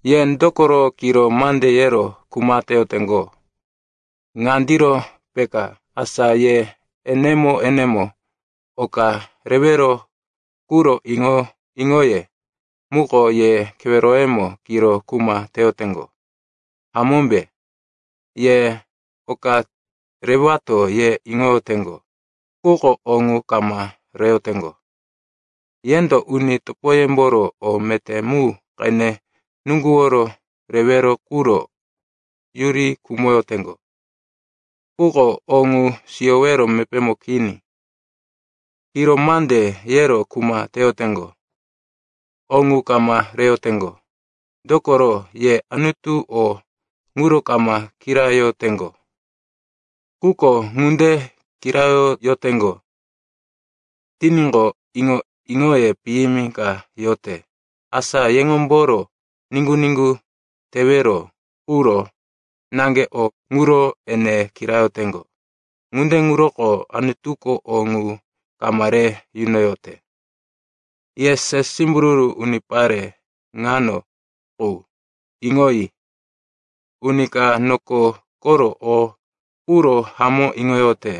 Ye dokoro kiro mande yero kuma teyoteŋgo? Ŋandiro peka, asa ye enemo-enemo oka rewero quro iŋo-iŋoye muko ye keweroyemo kiro kuma teyoteŋgo, hamómbe? Ye, oka rewato, ye iŋoyoteŋgo, quko o ŋu kama reyoteŋgo. Yendo uni topoyemboro o meté mu qene nuŋguworo rewero quro yuri khumoyoteŋgo, quko o ŋu siyowero mepémo kini. Kiro mande yero kuma teyoteŋgo. O ŋu kama reyoteŋgo, dokoro ye Anutu o ŋuro kama kirayoteŋgo. Quko ŋunde kirayoteŋgo tiníqo, iŋo-iŋoye piyimi ka yote, asa yeŋomboro niŋgu-niŋgu tewero quro naŋge o ŋuro ene kirayoteŋgo. Ŋunde ŋuroko Anutuko o ŋu kama re yunoyote. Ye se simbururu unipare ŋano qu, iŋoyi. Uni ka noko koro o quro hamó iŋoyote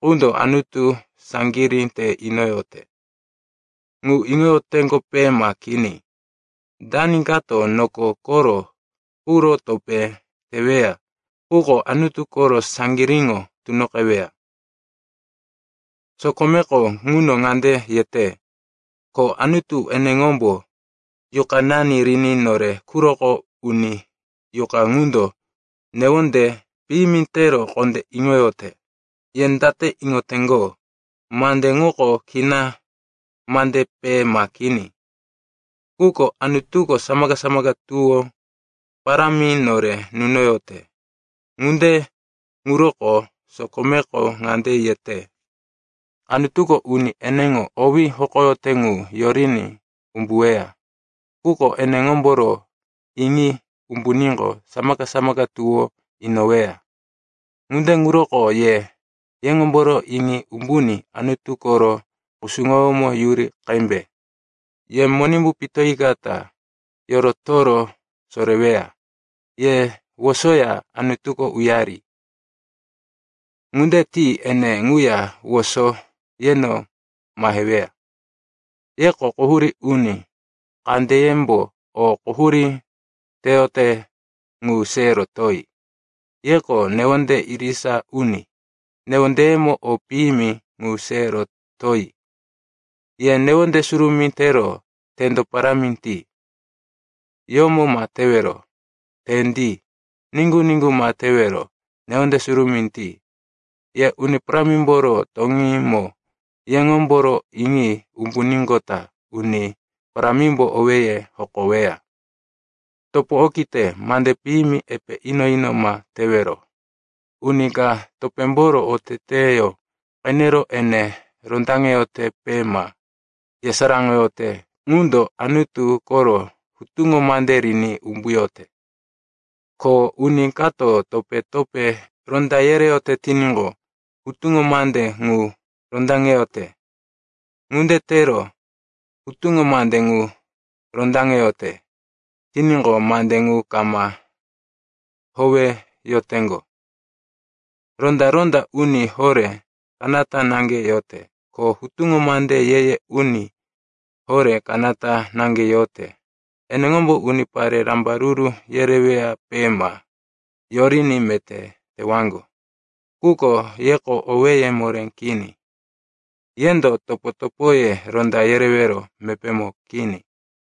qundo Anutu saŋgirí te inoyote. Ŋu iŋoyoteŋgope ma kini? Dani kato noko koro quro topé teweya ŋuko Anutu koro saŋgiríŋo tunoqeweya. Sokomeko ŋuno ŋande yete, ko Anutu eneŋombo yuqanani riní nore quroko uní yuqa ŋundo newonde piyimi tero kondé iŋoyote. Ye date iŋoteŋgo, mande ŋuko kina mandepe ma kini? Quko Anutuko samaka-samaka tuwó parámi nore nunoyote. Ŋunde ŋuroko sokomeko ŋande yete, “Anutuko uni eneŋo owí hokoyote ŋu yoriní umbuweya, quko eneŋomboro iŋi umbuníqo, samaka-samaka tuwó inoweya.” Ŋunde ŋuroko ye yeŋomboro iŋi umbuní Anutu koro kusuŋoyómo yuri qembe. Ye Monimbu pitoyikata yorotoro soreweya. Ye wosoya Anutuko uyari. Ŋunde ti ene ŋuya woso yeno maheweya. Yeko quhurí uni, kandeyembo o quhurí teyote ŋu se rotoyi. Yeko newonde irisa uni, newondeyemo o piyimi ŋu se rotoyi. Ye newonde surumí tero tendo parámi ti. Yomo ma tewero, tendi. Niŋgu-niŋgu ma tewero, newonde surumí ti. Ye Uni Parámimboro toŋímo yeŋomboro iŋi umbuníqota Uni Parámimbo owéye hokoweya. Topo okite, mande piyimi epe ino-ino ma tewero. Uni ka topémboro oteteyó qenero ene rondaŋeyotepe ma yesaráŋoyote ŋundo Anutu koro hutuŋo mande riní umbuyote. Ko uni kato topé-topé ronda yereyote tiníqo, hutuŋo mande ŋu rondaŋeyote. Ŋunde tero hutuŋo mande ŋu rondaŋeyote tiníqo, mande ŋu kama howeyoteŋgo. Ronda-ronda uni horé kanata naŋge yote. Ko hutuŋo mande ye-ye uni horé kanata naŋge yote. Eneŋombo unipare rambaruru yereweyape ma yoriní meté tewaŋgo. Quko yeko owéye moré kini. Yendo topo-topoye ronda yerewero mepémo kini.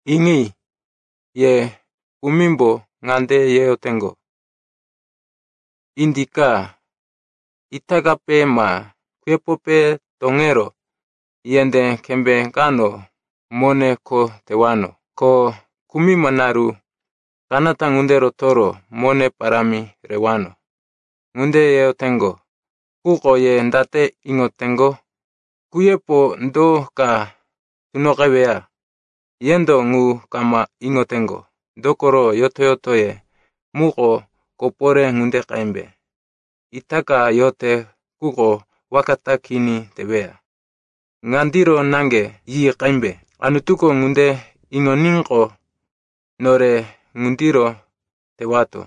Iŋi, ye kumimbo ŋande yeyoteŋgo, “Indika, itakape ma kuyepope toŋero yendé kembé kano mone kho tewano. Ko kumima naru kanata ŋunde rotoro mone parámi rewano.” Ŋunde yeyoteŋgo, quko ye date iŋoteŋgo? Kuyepo do ka tunoqeweya? Yendo ŋu kama iŋoteŋgo. Dokoro yoto-yotoye muko koporé ŋunde qembe. Itaka yote, quko waka ta kini teweya. Ŋandiro naŋge yi qembe, “Anutuko ŋunde iŋoníqo, nore ŋundiro tewato.”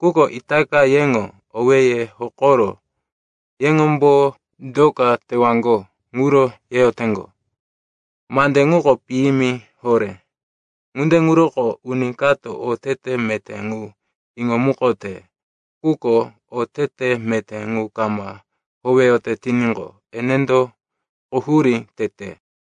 Quko itaka yeŋo owéye hokoro yeŋombo do ka tewaŋgo ŋuro yeyoteŋgo. Mande ŋuko piyimi horé. Ŋunde ŋuroko uni kato otete meté ŋu iŋomukote, quko otete meté ŋu kama howeyote tiníqo, enendo quhurí tete.